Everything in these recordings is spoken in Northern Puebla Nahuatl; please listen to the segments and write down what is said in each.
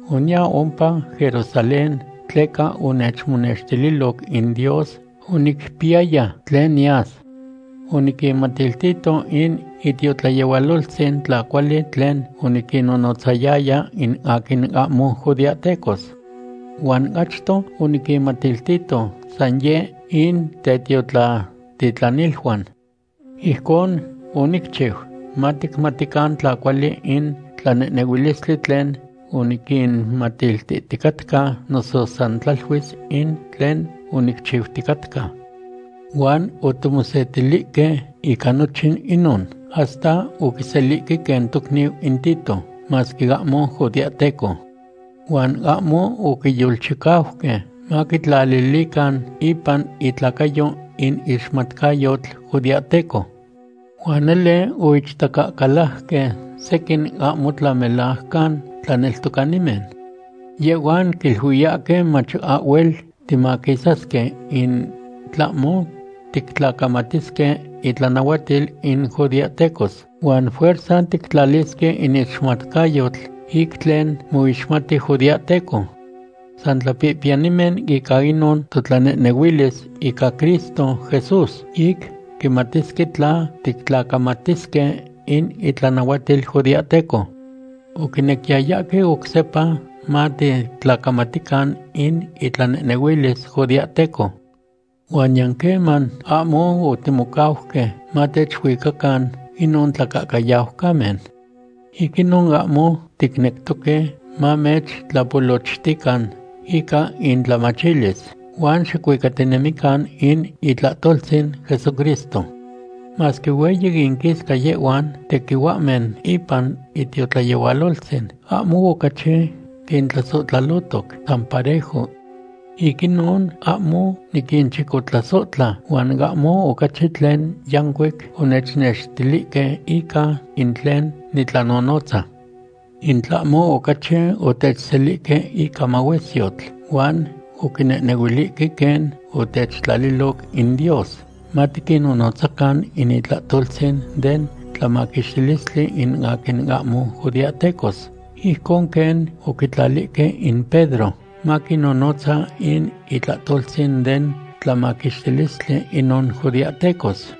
Oniya ompa Jerusalén tleca onechmonextililoc in Dios onicpiyaya tlen niyas. Oniquinmatiltito in itiotlayehualoltzin tla cuali tlen oniquinnonotzayaya in aquin ahmo judeahtecos. Huan achto oniquinmatiltito san yeh in tetiotlatitlaniluan. Ijcon onicchiu maticmatican tla cuali in tlanehnehuilistli tlen oniquinmatiltihticatca, noso san tlaluis in tlen onicchiuticatca. Huan otimosetilihque ica nochin inon, hasta oquiselihque quen tocniu in Tito, masque ahmo judeahteco. Huan ahmo oquiyolchicauque maquitlalilican ipan itlacayo in ixmatcayotl judeahteco. Huan nele oichtacacalajque sequin ahmo tlamelajcan tlaneltocanimen. Yehhuan quiluiyahque mach ahhuel timaquisasque in tlahmo tictlacamatisque itlanahuatil in judeahtecos, huan fuerza tictlalisque in ixmatcayotl ic tlen moixmati judeahteco. San tlapihpiyanimen ica inon totlanehnehuilis ica Cristo Jesús ic quimatisque tla tictlacamatisque in itlanahuatil judeahteco. Oquinequiyayahque oc sepa matictlacamatican in itlanehnehuilis judeahteco. Huan niyan queman ahmo otimocauque matechuicacan inon tlacahcayaucamen. Ic inon ahmo ticnectoque mamechtlapolochtican ica intlamachilis, huan xicuicatinemican in itlahtoltzin Jesucristo. Masque hueyi inquisca yehhuan tequihuahmen ipan itiotlayehualoltzin, ahmo ocachi quintlasohtlalotoc; san parejo. Ic inon ahmo niquinchicotlasohtla, huan ahmo ocachi tlen yancuic onechnextilihque ica in tlen nitlanonotza. In tlahmo ocachi otechselihque ica mahuesyotl, huan oquinehnehuilihque quen otechtlaliloc in Dios matiquinnonotzacan in itlahtoltzin den tlamaquixtilistli in aquin ahmo judeahtecos, ijcon quen oquitlalihque in Pedro maquinnonotza in itlahtoltzin den tlamaquixtilistli inon judeahtecos.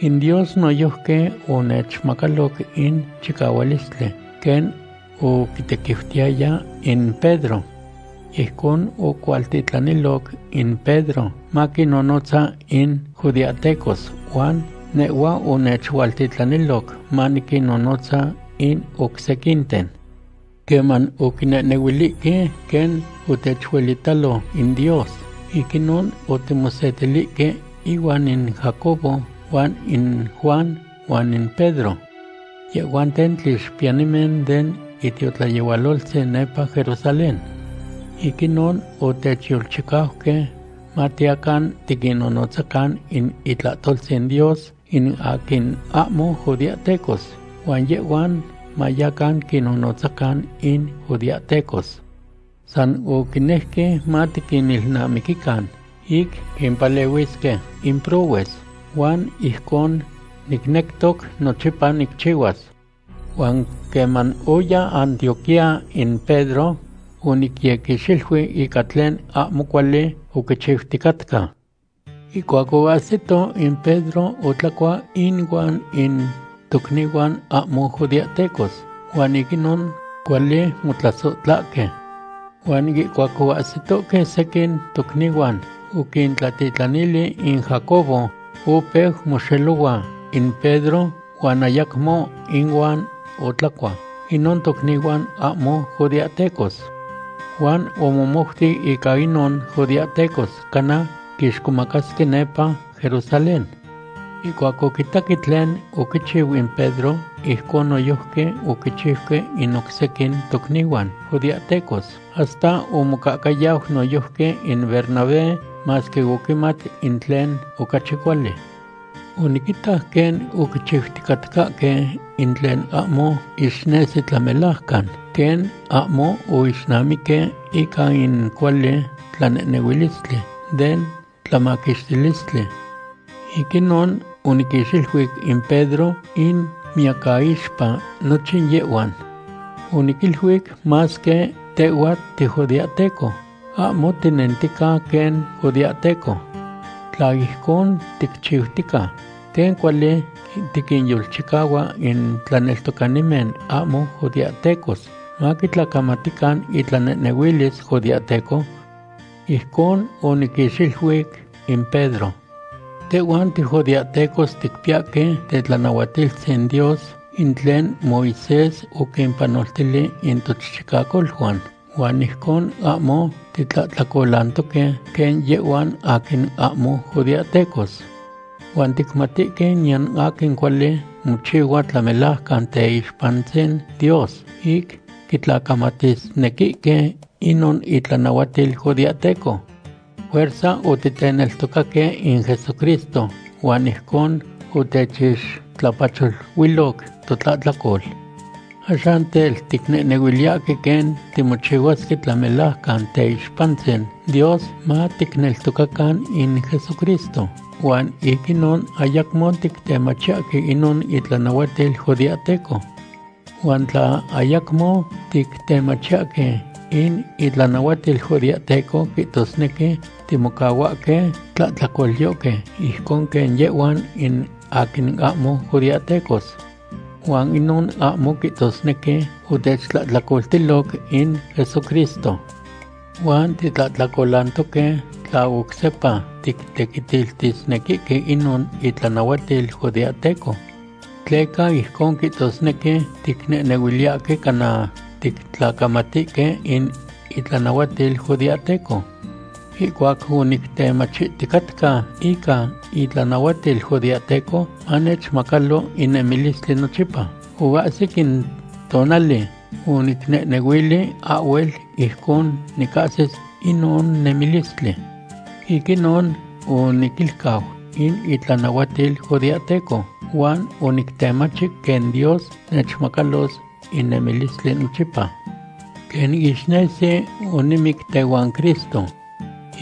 In Dios noyojqui onechmacaloc in chicahualistli quen oquitequiutiyaya in Pedro. Ijcon ocualtitlaniloc in Pedro maquinnonotza in judeahtecos huan nehhua onechualtitlaniloc maniquinnonotza in oc sequinten. Queman oquinehnehuilihque quen otechuelitalo in Dios, ic inon otimosetilihque inuan in Jacobo huan in Juan huan in Pedro. Yehhuanten tlixpiyanimen den itiotlayehualoltzin nepa Jerusalén. Ic inon otechyolchicauque matiyacan tiquinnonotzacan in itlahtoltzin Dios in aquin ahmo judeahtecos, huan yehhuan mayacan quinnonotzacan in judeahtecos. San oquinejque matiquinilnamiquican ic quimpalehuisque in prohues, huan ijcon nicnectoc nochipa nicchihuas. Huan queman oya Antioquía in Pedro, onicyequixiluic ica tlen ahmo cuali oquichiuticatca. Ihcuac oahsito, in Pedro otlacua inuan in tocnihuan ahmo judeahtecos huan ic inon cuali motlasohtlahque. Huan ihcuac oahsitohque sequin tocnihuan oquintlatitlanili in Jacobo, opeu moxelohua in Pedro huan ayacmo inuan otlacua inon tocnihuan ahmo judeahtecos. Huan omomouti ica inon judeahtecos, cana quixcomacasque nepa Jerusalén. Ihcuac oquitaque tlen oquichiu in Pedro, ijcon noyojqui oquichiuque in oc sequin tocnihuan judeahtecos, hasta omocahcayau noyojqui in Bernabé, masque oquimat in tlen ocachi cuali. Oniquitac quen oquichiuticatcahque in tlen ahmo ixnesi tlamelajcan, quen ahmo oixnamiqui ica in cuali tlanehnehuilistli den tlamaquixtilistli. Ic inon oniquixiluic in Pedro in miyacaixpa nochin yehhuan. Oniquiluic: “Masque tehhua tijudeahteco, ahmo tinentica quen judeahteco. ¿Tla ijcon ticchiutica, quen cuali tiquinyolchicahua in tlaneltocanimen ahmo judeahtecos maquitlacamatican itlanehnehuilis judeahteco?” Ijcon oniquixiluic in Pedro. Tehhuan tijudeahtecos ticpiyahque tetlanahuatiltzin Dios in tlen Moisés oquimpanoltili in tochichicacoluan, huan ijcon ahmo titlahtlacolantoque quen yehhuan aquin ahmo judeahtecos. Huan ticmatihque niyan aquin cuali mochihua tlamelajcan teixpantzin Dios ic quitlacamatisnequihque inon itlanahuatil judeahteco. Fuerza otiteneltocaque in Jesucristo, huan ijcon otechixtlapacholuiloc totlahtlacol. Axan tel, ticnehnehuiliyahque quen timochihuasque tlamelajcan teixpantzin Dios matiteneltocacan in Jesucristo, huan ic inon ayacmo tictemachiyahque inon itlanahuatil judeahteco. Huan tla ayacmo tictemachiyahque in itlanahuatil judeahteco, quihtosnequi timocahuahque tlahtlacolyohque ijcon quen yehhuan in aquin ahmo judeahtecos. Huan inon ahmo quihtosnequi otechtlahtlacoltiloc in Jesucristo. Huan titlahtlacolantoque tla oc sepa tictequitiltisnequihque inon itlanahuatil judeahteco. Tleca ijcon quihtosnequi ticnehnehuiliyahque cana tictlacamatinihque in itlanahuatil judeahteco. Ihcuac onictemachiticatca ica itlanahuatil judeahteco manechmacalo in nemilistli nochipa, oahsic in tonali onicnehnehuili ahhuel ijcon nicahsis inon nemilistli. Ic inon oniquilcau in itlanahuatil judeahteco huan onictemachi quen Dios nechmacalos in nemilistli nochipa. Quen ixnesi, onimic tehuan Cristo.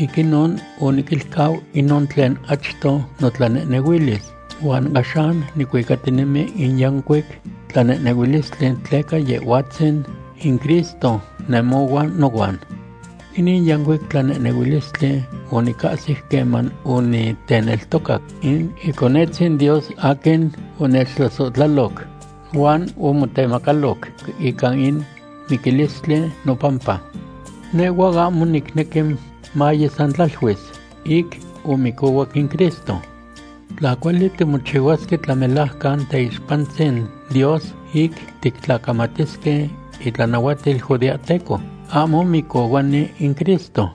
Ic inon oniquilcau inon tlen achto notlanehnehuilis, huan axan nicuicatinemi in yancuic tlanehnehuilistli tleca Yehhuatzin in Cristo nemohua nohuan. Inin yancuic tlanehnehuilistli onicahsic queman oniteneltocac in Iconetzin Dios aquin onechtlasohtlaloc huan omotemacaloc ica in miquilistli nopampa. Nehhua ahmo nicnequi maye san tlaluis ic omicohuac in Cristo. Tla cuali timochihuasque tlamelajcan teixpantzin Dios ic titlacamatisque itlanahuatil judeahteco, ahmo micohuani in Cristo.